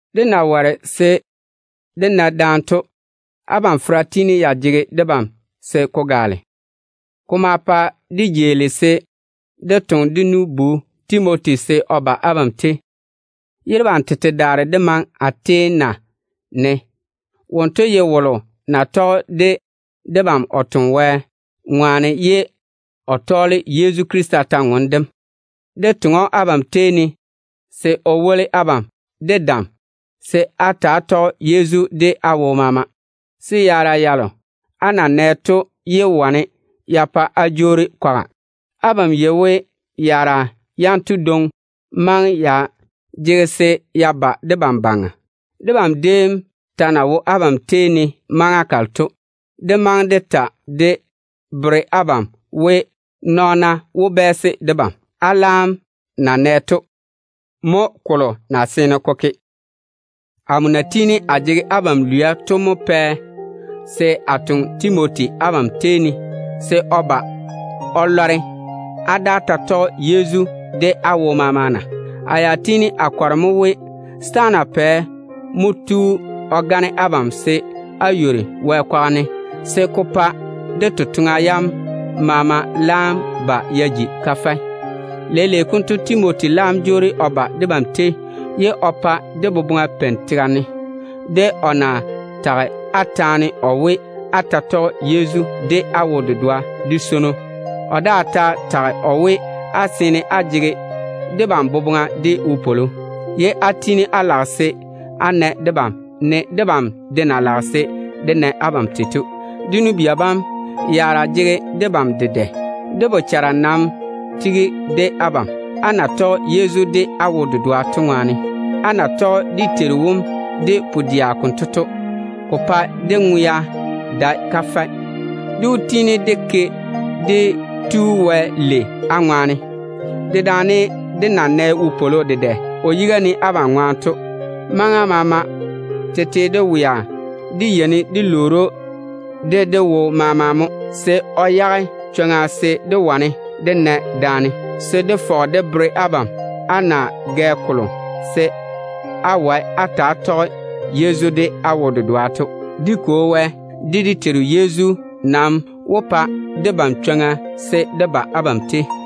Dé nam na ware se dé na daane to, abam fera tiini ya jege debam se ko gaale. Ko ma pa dé jeeli se dé toŋe dé nu-bu Timoti se o ba abam tei, ye debam tete daare dé maŋe Atena ne. Wonto ye wolo na tɔge de debam o toŋe Wɛ ŋwaane ye o tɔɔle Yezu Krista kwor-ywoŋa kam. Dé toŋe‑o abam tei ne se o woli abam de dam se á ta‑á tɔge Yezu de á wo maama, se yaara yalo á na nɛ to yé wane ya pa á jwoori kwaga. Abam yei we yaara yanto dwoŋi maŋe ya jege se ya ba debam baŋa. Debam déem ta na wo abam tei ne maŋa kalo to, dé maŋe dé ta dé bere abam we, nɔɔna wó bɛɛse debam. Á laam na nɛ to, mo kolo na seene ko ke. Amo na tiini a jege abam lwia to mo pɛ se a toŋe Timoti abam tei ne, se o ba o lɔre á daa ta tɔge Yezu de á wo maama na. Amo ya tiini a kɔre mo we, setaana pɛ mo tu o gane abam se á ywori Wɛ kwaga ne, se ko pa dé totoŋa yam maama laam ba ya ji kafɛ. Leile konto Timoti laam jwoori o ba debam tei ye o pa dé boboŋa peini tega ne, de o na tage á taane o we, á ta tɔge Yezu de á wo-dedoa de swono. O daa ta tage o we, á seene á jege debam boboŋa de wopwolo, ye á tiini á lage se á na debam, ne debam de na lage se dé na abam tei to. Dé nu-bia bam, yaara jege debam dedɛ. Dé bochara nam tiga de abam, á na tɔge Yezu de á wo-dedoa to ŋwaane. Á na tɔge dé Teiru wom de pu-dɛa konto to, ko pae dé ŋwea dae kafɛ. Dé wó tiini dé ke dé Tu Wɛ lei á ŋwaane, dedaane dé na nɛ wopwolo dedɛ o yiga ne abam ŋwaane to. Maŋa maama tete de wea dé yeini dé lwoori Wɛ de dé wo maama mo, se o yage chwoŋa se dé wane dé na daane, se dé fɔge dé bere abam á na gɛ kolo se á wae á ta‑á tɔge Yezu de á wo-dedoa to. Dé Kwo Wɛ de dé Teiru Yezu nam wó pa debam chwoŋa se dé ba abam tei.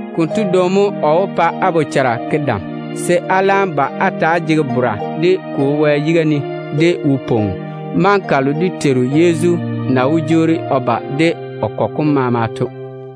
Konto dwoŋi mo o wó pa á bochara ke dam, se á laam ba á zege dé Kwo Wɛ yiga ne de wo-pwoŋo, ye á ba jege tusim, maŋa kalo dé Teiru Yezu na wó jwoori o ba de o nɔn-kɔgɔ kom maama to.